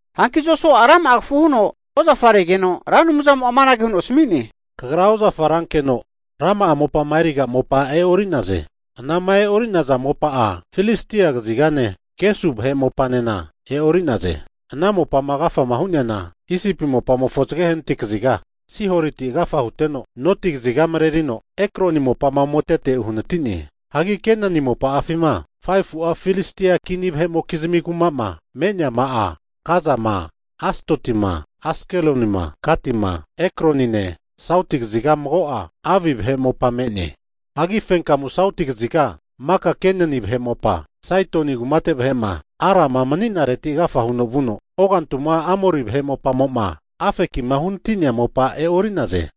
Hanki Josua'a rama'a kafu huno ozafaregeno, Ra Anumzamo'a amanage huno asmi'ne, Kagra ozafa rankeno rama'a mopama eriga mopa e'ori'naze. Ana'ma e'orinaza mopa'a Filistia kazigane, Gesu vahe mopanena e'ori'naze. Ana mopama agafa hu'neana, Isipi mopamofo zage hanati kaziga Sihoriti agafa huteno, noti kaziga marerino Ekroni mopama ometete uhanati'ne. Hagi Kenani mopa'afima 5fu'a Filistia kini vahe'mokizmi kuma'ma me'neama'a Gazama, Asdotima, Askelonima, Gatima, Ekronine sauti kaziga mago'a Avi vahe mopa me'ne. Hagi fenkamu sauti kaziga maka Kenani vahe mopa, Saidoni kumate vahe'ma Arama nemanireti agafa huno vuno, ogantuma Amori vahe mopamo'ma Afekima uhanati'nea mopa e'ori'naze.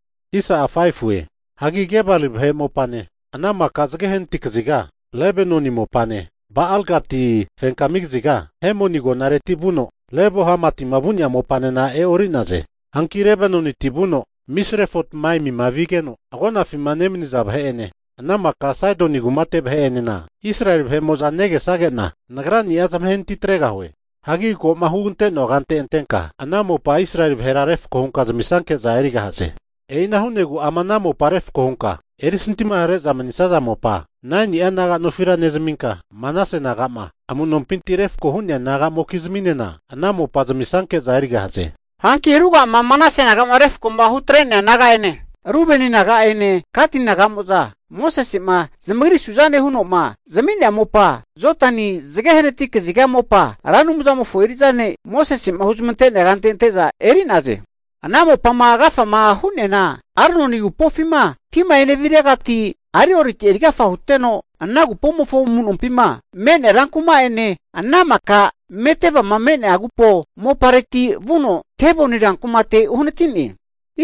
Hagi Gebali vahe mopane, ana maka zage hanati kaziga Lebanoni mopane, Ba'al-Gati fenka kaziga Hemoni agonareti vuno Lebo Hamatima vu'nea mopanena e'ori'naze. Hanki Lebanoniti vuno Misrefot Maimima vigeno, agonafima nemaniza vahe'ene ana maka Saidoni kumate vahe'enena, Israeli vahe'mo'za negesage'na Nagrani'a zamahe natitregahue. Hagi ko'ma hugante'noa kante atenka, ana mopa Israeli vahera refko hunka zamisanke'za erigahaze. E'ina hu'negu ama ana mopa refko hunka erisantima hare'za manisaza mopa 9ni'a naga nofira nezaminka, Manase naga'ma amu'nompinti refko hu'nea, naga'mokizminena ana mopa zamisnanke'za erigahaze. Hanki ruga'ama Manase naga'ma refko'ma hutre'nea naga'ene, Rubeni naga'ene Gati naga'mo'za Mosese'ma zamagri su'zane hu'noma zami'nea mopa Jodani zage hanati kaziga mopa Ra Anumzamofo eri'za ne' Mosese'ma huzmante'nea kante ante'za eri'naze. Ana mopama agafama hu'neana, Arnoni agupofima tima eneviregati Aroeriti agafa huteno, ana agupomofo amu'nompima me'nea rankuma'ene, ana maka Medebama me'nea agupo mopareti vuno, Diboni rankumate uhanati'ne.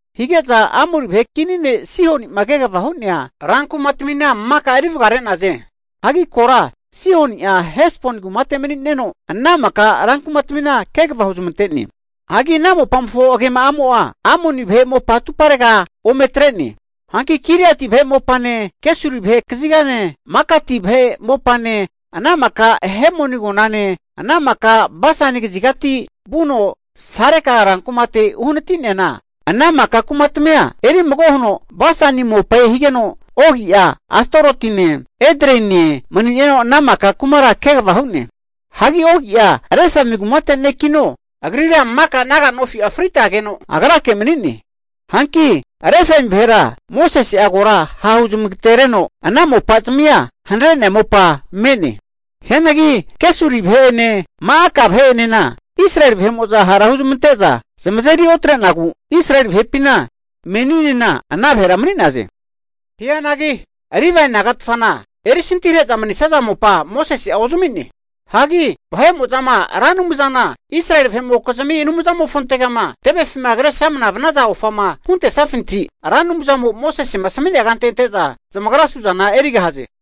Hige'za Amori vahe kini ne' Sihoni'ma kegava hu'nea rankumatamina maka eri vagare'naze. Hagi kora Sihoni'a Hesboni kumate mani'neno ana maka rankumatamina kegava huzmante'ne. Hanki ana mopamofo agema'amo'a Amoni vahe mopa atuparega ome atre'ne. Hanki Giliati vahe mopane, Gesuri vahe kazigane, Makati vahe mopane, ana maka Hemoni agonane, ana maka Basani kazigati vuno Saleka rankumate uhanati'neana, ana maka kumatmia eri mago huno Basani mopae higeno, Ogi'a Astarotine Edreine mani'neno ana maka kumara kegava hu'ne. Hagi Ogi'a Refai kumate ne'kino, agrira maka naga nofi'a fritageno agrake mani'ne. Hanki Refai vahera Mosese'a kora ha' huzmagatereno ana mopazamia hanare'nea mopa me'ne. Hianagi Geshuri vahe'ene Ma'aka vahe'enena Israeli vahe'mo'za hara huzmante'za zamazeri otre'nagu, Israeli vahepina meninena ana vahera mani'naze. Hianagi Livae nagatfana erisantihare'za manisaza mopa Mosese'a ozami'ne. Hagi vahe'mo'zama Ra Anumzana Israeli vahe'mokizmi Anumzamofontegama tevefima kresramna vanaza ofama huntesafinti, Ra Anumzamo'ma Mosesema asmi'nea kante ante'za zamagra suzana erigahaze.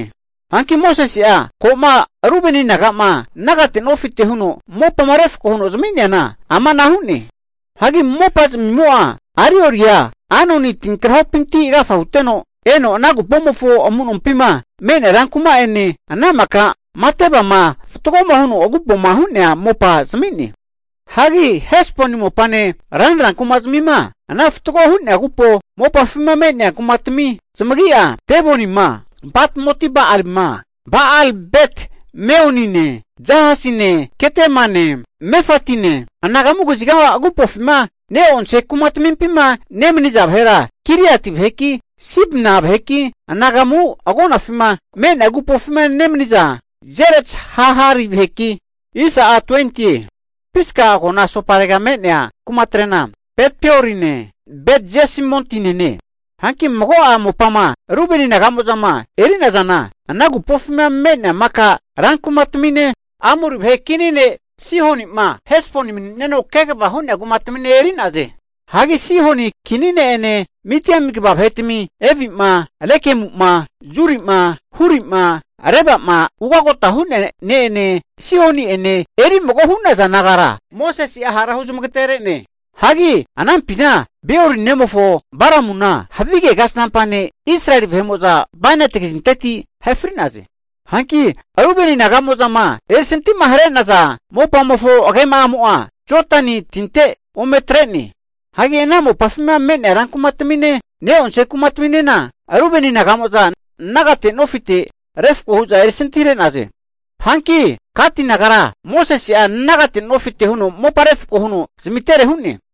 Hanki Mosese'a ko'ma Rubeni naga'ma nagate nofite huno mopama refko huno zami'neana amana hu'ne, Hagi mopazmimo'a Aroeria Arnoni tinkrahopinti agafa huteno, eno ana agupomofo amu'nompima me'nea rankuma'ene, ana maka Madebama fatgoma huno agupoma hu'nea mopa zami'ne. Hagi Hesboni mopane ranra kumazamima ana fatgo hu'nea agupo mopafima me'nea kumatmi zamagi'a, Dibonima Batmot-Ba'alima, Ba'al-Bet-Meonine, Jahazine Kedemane, Mefatine, anagamu kaziga agupofima ne'onse kumatamimpima nemaniza vahera Kiriati vaheki, Sibma vaheki, anagamu agonafima me'nea agupofima nemaniza Zeret-Shahari vaheki, Pisga agona asoparega me'nea kumatre'na Bet-Peorine, Bet-Jesimotinene. Hanki mago'a mopama Rubeni naga'mo'zama eri'nazana, ana agupofima me'nea maka rankumatamine, Amori vahe kini ne' Sihoni'ma Hesboni mani'neno kegava hu'nea kumatamine eri'naze. Hagi Sihoni kini ne'ene Midieni kva vahetami Evima, Rekemu'ma, Zuri'ma, Huri'ma Reba'ma ugagota hu'nea ne'ene, Sihoni'ene eri mago hu'naza nagara Mosese'a hara huzamagatere'ne. Hagi anampina Beori nemofo Balamuna havige kasnampa ne' Israeli vahe'mo'za bainati kazinteti ahe fri'naze. Hanki Rubeni naga'mo'zama erisantima hare'naza mopamofo agema'amo'a, Jodani tinte ometrene. Hagi ana mopafima me'nea rankumatamine ne'onse kumataminena, Rubeni naga'mo'za nagate nofite refko hu'za erisantihare'naze. Hanki Gati nagara Mosese'a nagate nofite mopa refko huno zamitere hu'ne.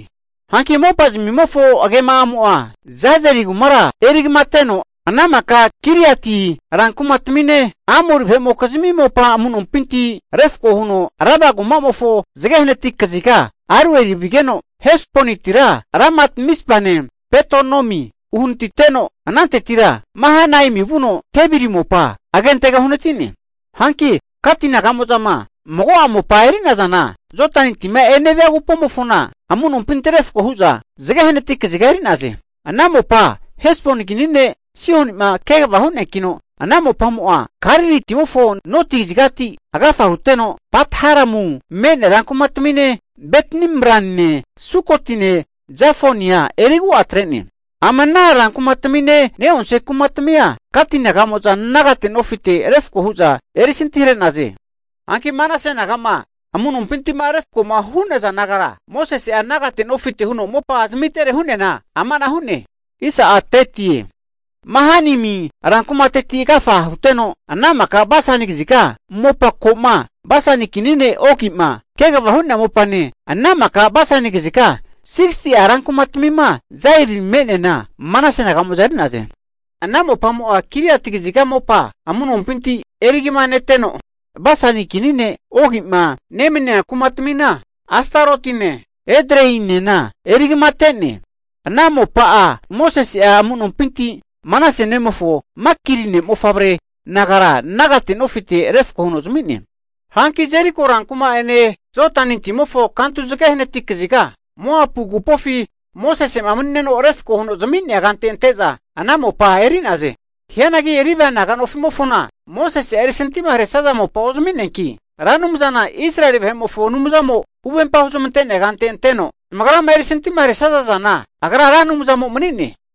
Hanki mopazamimofo agema'amo'a Jazeri kumara erigamateno, ana maka Giliati rankumatamine, Amori vahe'mokizmi mopa amu'nompinti refko huno Raba kumamofo zage hanati kaziga Aroeri vigeno, Hesbonitira Ramat Mizpane, Betonimi uhanatiteno, anantetira Mahanaimi vuno Debiri mopa agentega uhanati'ne. Hanki Gati naga'mo'zama mago'a mopama eri'nazana, Jodani tima enevia agupomofona amu'nompinti refko hu'za zage hanati kaziga eri'naze. Ana mopa Hesboni kini ne' Sihoni'ma kegava hu'neankino, ana mopamo'a Galili timofo noti kazigati agafa huteno, Bet-Haramu me'nea rankumatamine, Bet-Nimrane, Sukotine, Zafonia erigu'a atre'ne. Ama ana rankumatamine ne'onse kumatamia Gati naga'mo'za nagate nofite refko hu'za erisantihare'naze. Hanki Manase naga'ma amu'nompinti'ma refko hu'naza nagara Mosese'a nagate nofite huno mopa zamitere hu'neana, amanahu hu'ne. Mahanaimi rankumateti agafa huteno, ana maka Basani kaziga mopa ko'ma Basani kini ne' Ogi'ma kegava hu'nea mopane, ana maka Basani kaziga 60'a rankumatmima Jair me'neana Manase naga'mo'za eri'naze. Ana mopamo'a Giliati kaziga mopa amu'nompinti erigama neteno, Basani kini ne' Ogi'ma nemania kumatmina, Astarotine Edreinena erigamate'ne, ana mopa'a Mosese'a amu'nompinti Manase nemofo Makiri ne'mofavre nagara nagate nofite refko huno zami'ne. Hanki Jeriko rankuma'ene Jodani timofo kantu zage hanati kaziga, Moapu agupofi Mosese'ma mani'neno refko huno zami'nea kante ante'za ana mopa eri'naze. Hianagi Livae naga nofimofona Mosese'a erisantima haresaza mopa ozami'neanki, Ra Anumzana Israeli vahe'mofo Anumzamo huvempama huzmante'nea kante ante'no zamagrama erisantima haresaza zana agra Ra Anumzamo mani'ne.